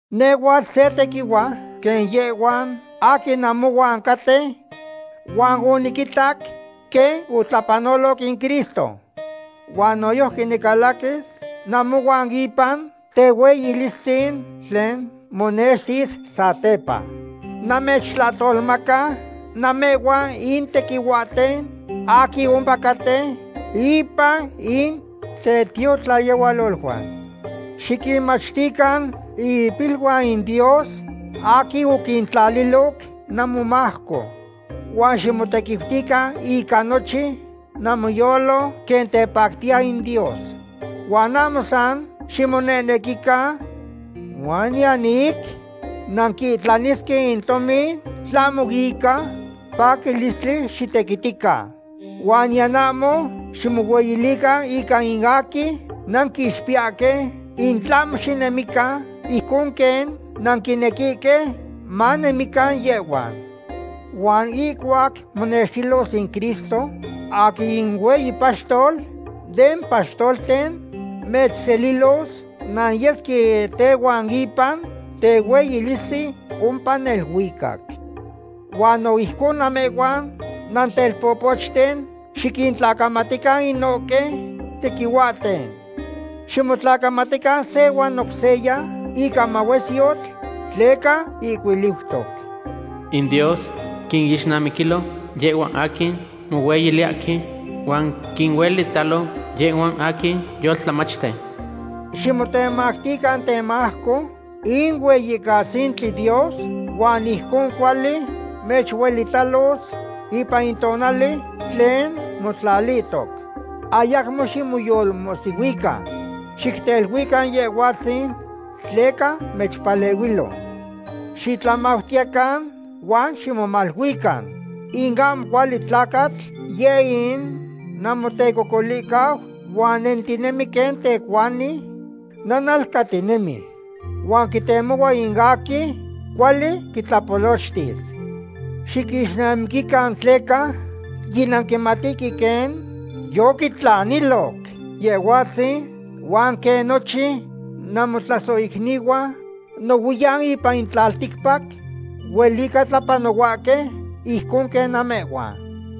Nehhuatl se tequihua quen yehhuan aquin namohuan caten, huan oniquitac quen otlapanoloc in Cristo. Huan noyojqui nicalaquis namohuan ipan tehueyilistzin tlen monextis satepa. Namechtlahtolmaca namehhuan in tequihuahten aquin ompacaten ipan in tetiotlayehualoluan. Xiquinmachtican in ipiluan in Dios aquin oquintlaliloc namomajco. Huan ximotequiutican ica nochin namoyolo quen tepactiya in Dios. Huan ahmo san ximonehnequican, huan niyan ic nanquitlanisque in tomin, tlahmo ica paquilistli xitequitican. Huan niyan ahmo ximohueyilican ica in aquin nanquinixpiyahque, in tlahmo xinemican ijcon quen nanquinequihque manemican yehhuan. Huan ihcuac monextilos in Cristo, aquin in hueyi paxtol den paxtolten, mechselilos nanyesque tehuan ipan tehueyilistzin ompa neluicac. Huan no ijcon namehhuan nantelpopochten, xiquintlacamatican inohque tequihuahten. Ximotlacamatican se huan oc seya, ica mahuesyotl, tleca ihcuiliutoc: In Dios quinixnamiquilo yehhuan aquin mohueyiliyahque, huan quinuelitalo yehhuan aquin yoltlamachten. Ximotemactican temajco in Hueyicatzintli Dios, huan ijcon cuali mechueyililos ipan in tonali tlen motlalihtoc. Ayacmo ximoyolmohsihuican. Xicteluican Yehhuatzin, tleca mechpalehuilo. Xitlamautiyecan huan ximomaluican. In ahmo cuali tlacatl yeh in namotecocolicau, huan nentinemi quen tecuani nanalcatinemi. Huan quitemohua in aquin cuali quitlapolochtis. Xiquixnamiquican tleca yinanquimatihque quen yoquitlaniloc Yehhuatzin, huan quen nochin namotlasohicnihuan nohuiyan ipan in tlalticpac huelica tlapanohuahque ijcon quen namehhuan.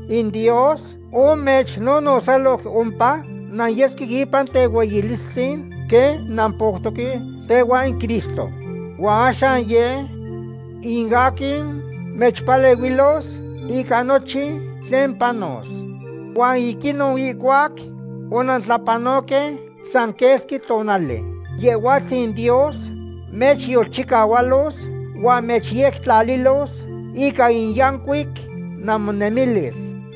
In Dios omechnonotzaloc ompa nanyesque ipan tehueyilistzin quen nampoutoque tehuan in Cristo. Huan axan yeh in aquin mechpalehuilos ica nochin tlen panos. Huan ic inon ihcuac onantlapanohque san quesqui tonali, Yehhuatzin Dios mechyolchicahualos huan mechyectlalilos ica in yancuic namonemilis.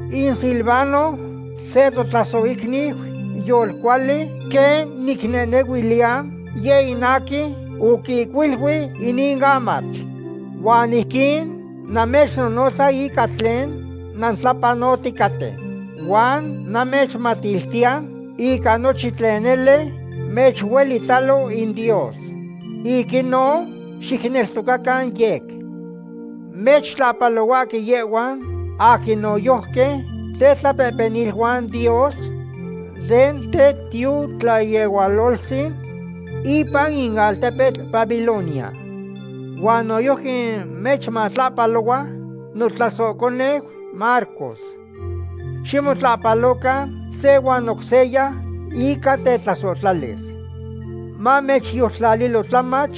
In Silvano, se totlasohicniu yolcuali, quen nicnehnehuiliya, yeh in aquin oquihcuilui inin amatl. Huan ijquin namechnonotza ica tlen nantlapanoticaten. Huan namechmatiltiya ica nochin nele mechuelitalo in Dios. Ic inon xicneltocacan yec. Mechtlahpalohuahque yehhuan aquin noyojqui tetlapehpeniluan Dios den tetiotlayehualoltzin ipan in altepetl Babilonia. Huan noyojqui mechtlahpalohua notlasohconeu Marcos. Ximotlahpalocan se huan oc seya ica tetlasohtlalis. Mamechyoltlalilo tlamach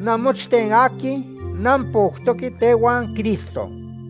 namochten aquin nampoutoque tehuan Cristo.